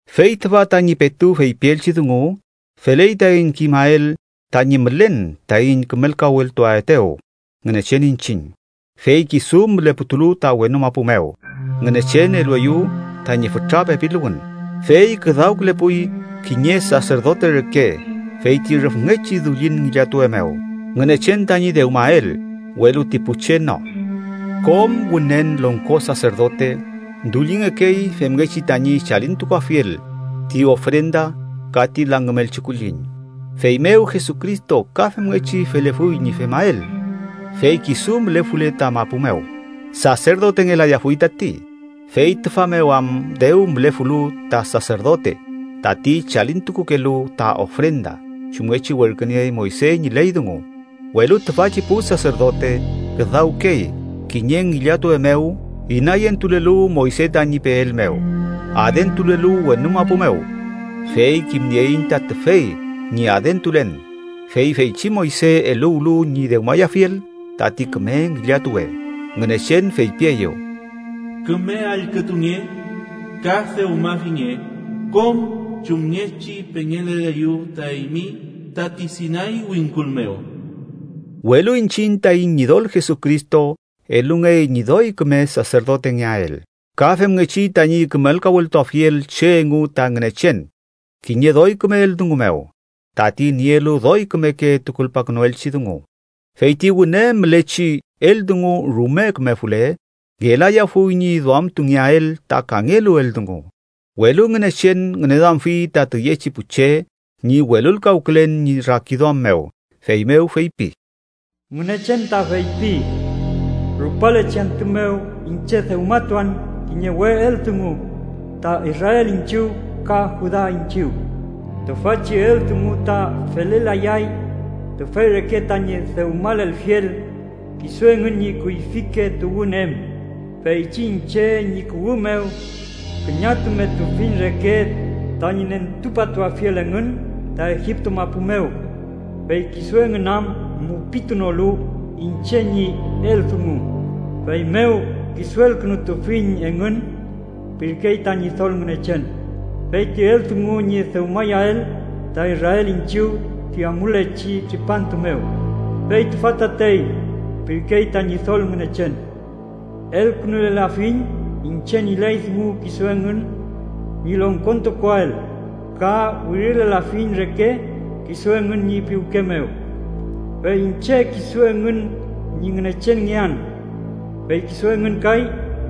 Fey tüfa tañi petu feypielchi dungu: feley taiñ kimael tañi mülen taiñ kümelkaweltuaetew Ngünechen iñchiñ, fey kisu müleputulu ta wenu mapu mew, Ngünechen elueyew tañi fütra pepiluwün. Fey küdawkülepuy kiñe saserdote reke feyti rüfngechi dullin ngillatuwe mew, Ngünechen tañi dewmael, welu ti pu che no. Kom Wünen Longko Saserdote dullingekey femngechi tañi chalintukuafiel ti ofrenda ka ti langümelchi kulliñ, feymew Jesucristo ka femngechi felefuy ñi femael. Fey kisu mülefule ta mapu mew, saserdotengelayafuy tati, fey tüfa mew am dew mülefulu ta saserdote tati chalintukukelu ta ofrenda chumngechi werküniey Moyse ñi ley dungu. Welu tüfachi pu saserdote küdawkey kiñe ngillatuwe mew inayentulelu Moyse tañi peel mew, adentulelu wenu mapu mew. Fey kimnieiñ ta tüfey ñi adentulen, fey feychi Moyse eluwlu ñi dewmayafiel tati küme ngillatuwe, Ngünechen feypieyew: “Küme allkütunge ka dewmafinge kom chumngechi pengeleleyu ta eymi tati Sinay wingkul mew.” Welu iñchiñ taiñ Ñidol Jesucristo elungey ñi doy küme saserdotengeael ka femngechi tañi kümelkaweltuafiel che engu ta Ngünechen kiñe doy küme eldungu mew, tati nielu doy kümeke tukulpakünuelchi dungu. Fey ti wüne mülechi eldungu rume kümefule, ngelayafuy ñi duamtungeael ta kangelu eldungu, welu Ngünechen ngüneduamfi ta tüyechi pu che ñi welulkawkülen ñi rakiduam mew, feymew feypi: “Ngünechen ta feypi: Rupalechi antü mew iñche dewmatuan kiñe we eldungu ta Israel iñchiw ka Juda iñchiw. Tüfachi eldungu ta felelayay tüfey reke tañi dewmalelfiel kisu engün ñi kuyfike tuwün em, feychi iñche ñi kuwü mew küñatumetufiñ reke tañi nentupatuafiel engün ta Egipto mapu mew: Fey kisu engün am mupitunolu iñche ñi eldungu, feymew kisuelkünutufiñ engün, pirkey ta Ñidol Ngünechen. Fey ti eldungu ñi dewmayael ta Israel iñchiw ti amulechi tripantu mew, fey tüfa tatey, pirkey ta Ñidol Ngünechen: Elkünulelafiñ iñche ñi ley dungu kisu engün ñi longkontukuael ka wirilelafiñ reke kisu engün ñi piwke mew. Fey iñche kisu engün ñi Ngünechenngean, fey kisu engün kay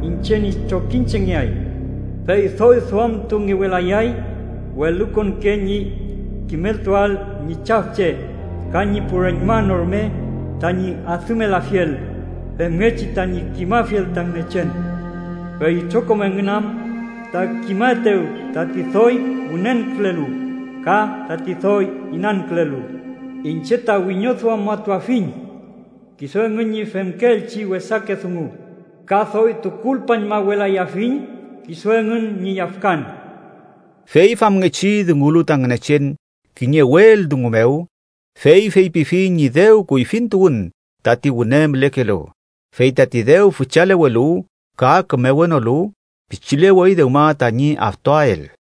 iñche ñi trokiñchengeay. Fey doy duamtungewelayay welukonke ñi kimeltuael ñi chafche ka ñi pu reñma no rume tañi adümelafiel, femngechi tañi kimafiel ta Ngünechen, fey itrokom engün am ta kimaetew tati doy wünenkülelu ka tati doy inankülelu. Iñche ta wiñoduamatuafiñ kisu engün ñi femkeelchi wesake dungu, ka doy tukulpañmawelayafiñ kisu engün ñi yafkan.” Fey famngechi dungulu ta Ngünechen kiñe we eldungu mew, fey feypifi ñi dew kuyfintuwün tati wüne mülekelu. Fey tati dew füchalewelu ka kümewenolu, pichilewey dewma tañi aftuael.